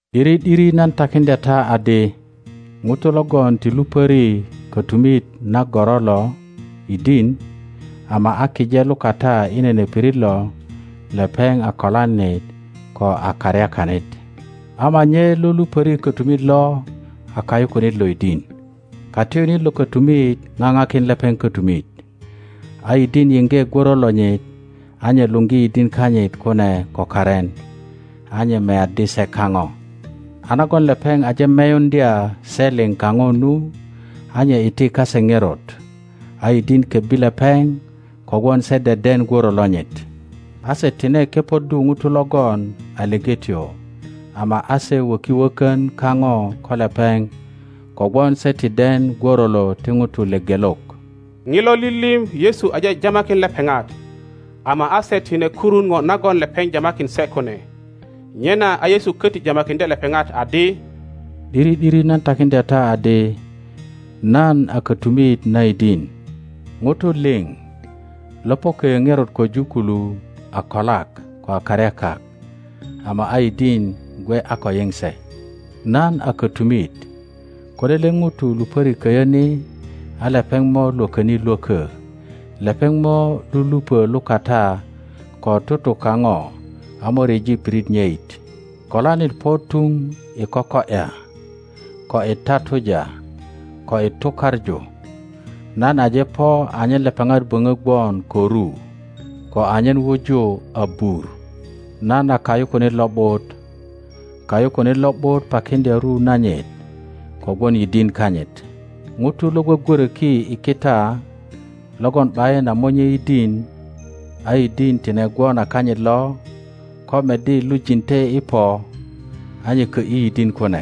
’Diri ’diri nan takiŋdya ta adi, Ŋuto logon ti lupöri kötumit na goro lo yidin, ama a kije lukata i nene pirit lo, lepeŋ a kolanit ko a karyakanit; ama nye lo lupöri kötumit lo a kayukunit lo yidin. Katiyunit lo kötumit ŋaŋakin lepeŋ kötumit, a yidin yiŋge gworo lonyit; a nye luŋgi yidin kanyit kune ko karin, a nye meyaddi se kaŋo. A nagon lepeŋ aje meyuŋdya se liŋ kaŋo nu, a nye iti kase ŋerot, a yidin kebbi lepeŋ kogwon se deden gworo lonyit. A se tine kepoddu ŋuto logon a lepetyo, ama a se wöki wökön kaŋo ko lepeŋ kogwon se ti den gworolo ti ŋutu lepelok. Ŋilo lilim Yesu aje jamakin lepeŋat, ama a se tine kurun ŋo nagon lepeŋ jamakin se kune. Nyena a Yesu köti jamakiŋdye lepeŋat adi, ’Diri ’diri nan takiŋdya ta adi, Nan a kötumit na yidin. ŋutu liŋ lo po köyö ŋerot köju kulu a kolak ko a karyakak, ama a yidin gwe a ko yiŋ se. Nan a kötumit; ko lele ŋuto lupöri köyö ni a lepeŋ mo lwököni lwökö, lepeŋ mo lulupö lukata ko tutu kaŋo a mo ryeji pirit nyeŋ. Kolanit po tuŋ i koko ’ya, ko i tatuja, ko i tukaŋu. Nan aje po anyen lepeŋat böŋö gwon ko ru, ko anyen wuju abur. Nan a kayukunit lo ’but. Kayukunit lo ’but pakiŋdya ru nanyit kogwon yidin kanyit. ŋuto lo gwogwöröki i kita, logon ’bayin a monye yidin a yidin tine gwon a kanyit lo, ko meddi lujinte i po, a nye kö ’yi yidin kune,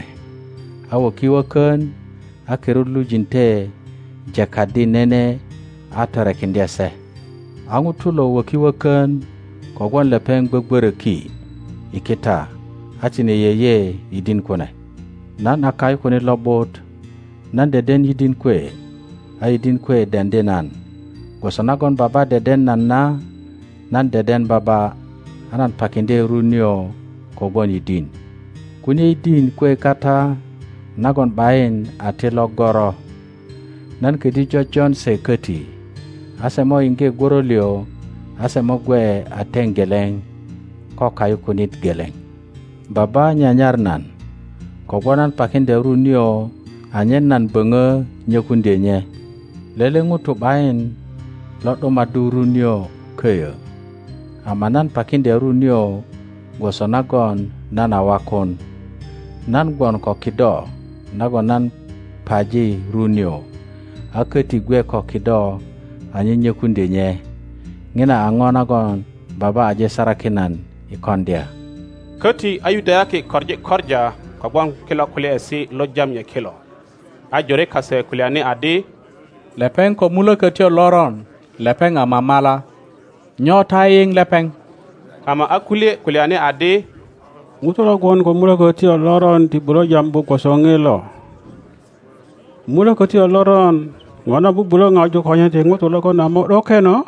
a wöki wökön, a kirut lujinte jekaddi nene a torekiŋdye se. A ŋuto lo wöki wökön kogwon lepeŋ gwögworöki i kita a tine yeye yidin kune. Nan a kayukunit lo ’but; nan deden yidin kwe, a yidin kwe deŋdi nan, gwoso nagon Baba deden nan na, nan deden Baba; a nan pakiŋdye ru nio kogwon yidin. Kunie yidin kwe kata nagon ’bayin a ti lo goro. Nan ködyö jojon se köti, a se mo yiŋge gworo liŋ, a se mo gwe a teŋ geleŋ ko kayukunit geleŋ. Baba nyanyar nan kogwon nan pakiŋdya ru nio anyen nan böŋö nyökuŋdyö nye. Lele ŋuto ’bayin lo ’dumaddu ru nio köyö, ama nan pakiŋdya ru nio gwoso nagon nan a wakun. Nan gwon ko kido nagon nan paji ru nio, a köti gwe ko kido anyen nyökuŋdyö nye. Ŋina a ŋo nagon Baba aje sarakin nan i koŋdya. Köti a Yudayaki koŋi koŋa kogwon kilo kulyaesi lo jam nye kilo. A jore kase kulyani adi, Lepeŋ ko mulökötyo loron, lepeŋ a mamala. Nyo ta yiyiŋ lepeŋ? Ama a kulye kulyani adi, Ŋuto lo gwon ko mulökötyo loron ti bulö jambu gwoso ŋilo. Mulökötyo loron ŋona bubulö ŋaju konyen ti ŋutu logon a mo ’dokeno?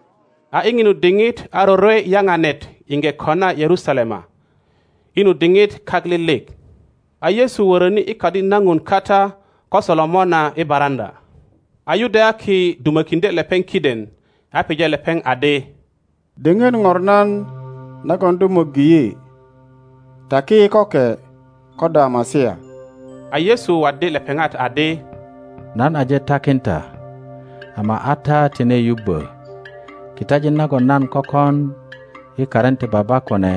A i ŋinu diŋit a rorwe Yaŋanet iŋge kona Yerusalema. I nu diŋit kak lilik, a Yesu wöröni i Kadi na ŋun kata ko Solomona i baraŋöa. a Yudayaki dumökiŋdye lepeŋ kiden, a pije lepeŋ adi, Diŋit ŋornan nagon do möggi yi? Taki yi köke ko do a Masia. A Yesu waddi lepeŋat adi, Nan aje takin ta, ama a ta tine yubbö. Kitajin nagon nan kökon i karin ti Baba kune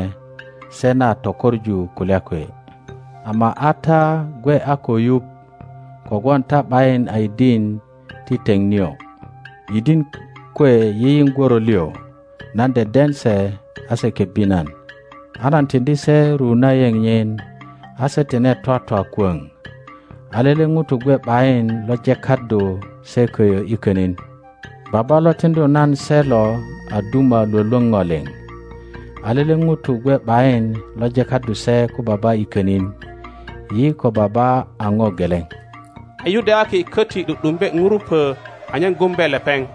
se na tökoŋu kulya kwe; ama a ta gwe a ko yuŋ kogwon ta ’bayin a yidin ti teŋ nio. Yidin kwe yiyiŋ gworo liŋ; nan deden se a se kebbi nan. a nan tiŋdi se ru na yeŋ nyin, a se tine twatwa kwöŋ; a lele ŋuto gwe ’bayin lo jekaddu se köyö i könin. Baba lo tiŋdu nan se lo a duma lwölwöŋ ŋo liŋ, a lele ŋuto gwe ’bayin lo jekaddu se ko Baba i könin. Yi ko Baba a ŋo geleŋ. A Yudayaki köti ’du ’dumbe ŋurupö anyen gumbe lepeŋ.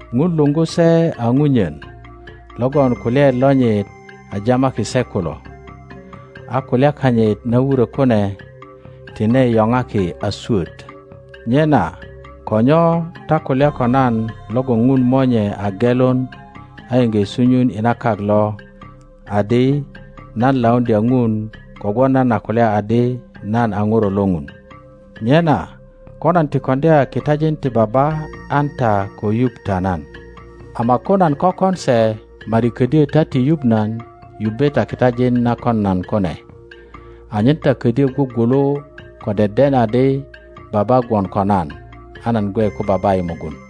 Ŋun luŋgu se a ŋunyen logon kulyaet lonyit a jamaki se kulo, a kulya kanyit na wurö kune tine yoŋaki a swöt. Nyena ko nyo ta kulya ko nan logon Ŋun Monye a gelun a iŋge sunyun i na kak lo, adi nan lauŋdya Ŋun kogwon nan a kulya adi nan a Ŋuro lo Ŋun? Nyena ko nan ti koŋdya kitajin ti Baba an ta ko yuŋ ta nan; ama ko nan kökon se, ma ’di ködyö ta ti yuŋ nan yubbe ta kitajin na kon nan kune, anyen ta ködyö gwugwulu ko deden adi Baba gwon ko nan, a nan gwe ko Baba i mugun.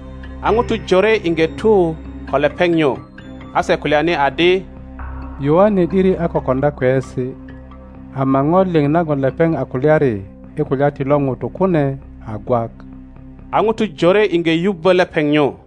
a ŋutu jore iŋge tu ko lepeŋ nyu. A se kulyani adi, Yoane ’diri a ko koŋdya kweyesi. ama ŋo liŋ nagon lepeŋ a kulyari i kulya ti lo ŋuto kune a gwak. a ŋutu jore iŋge yubbö lepeŋ nyu.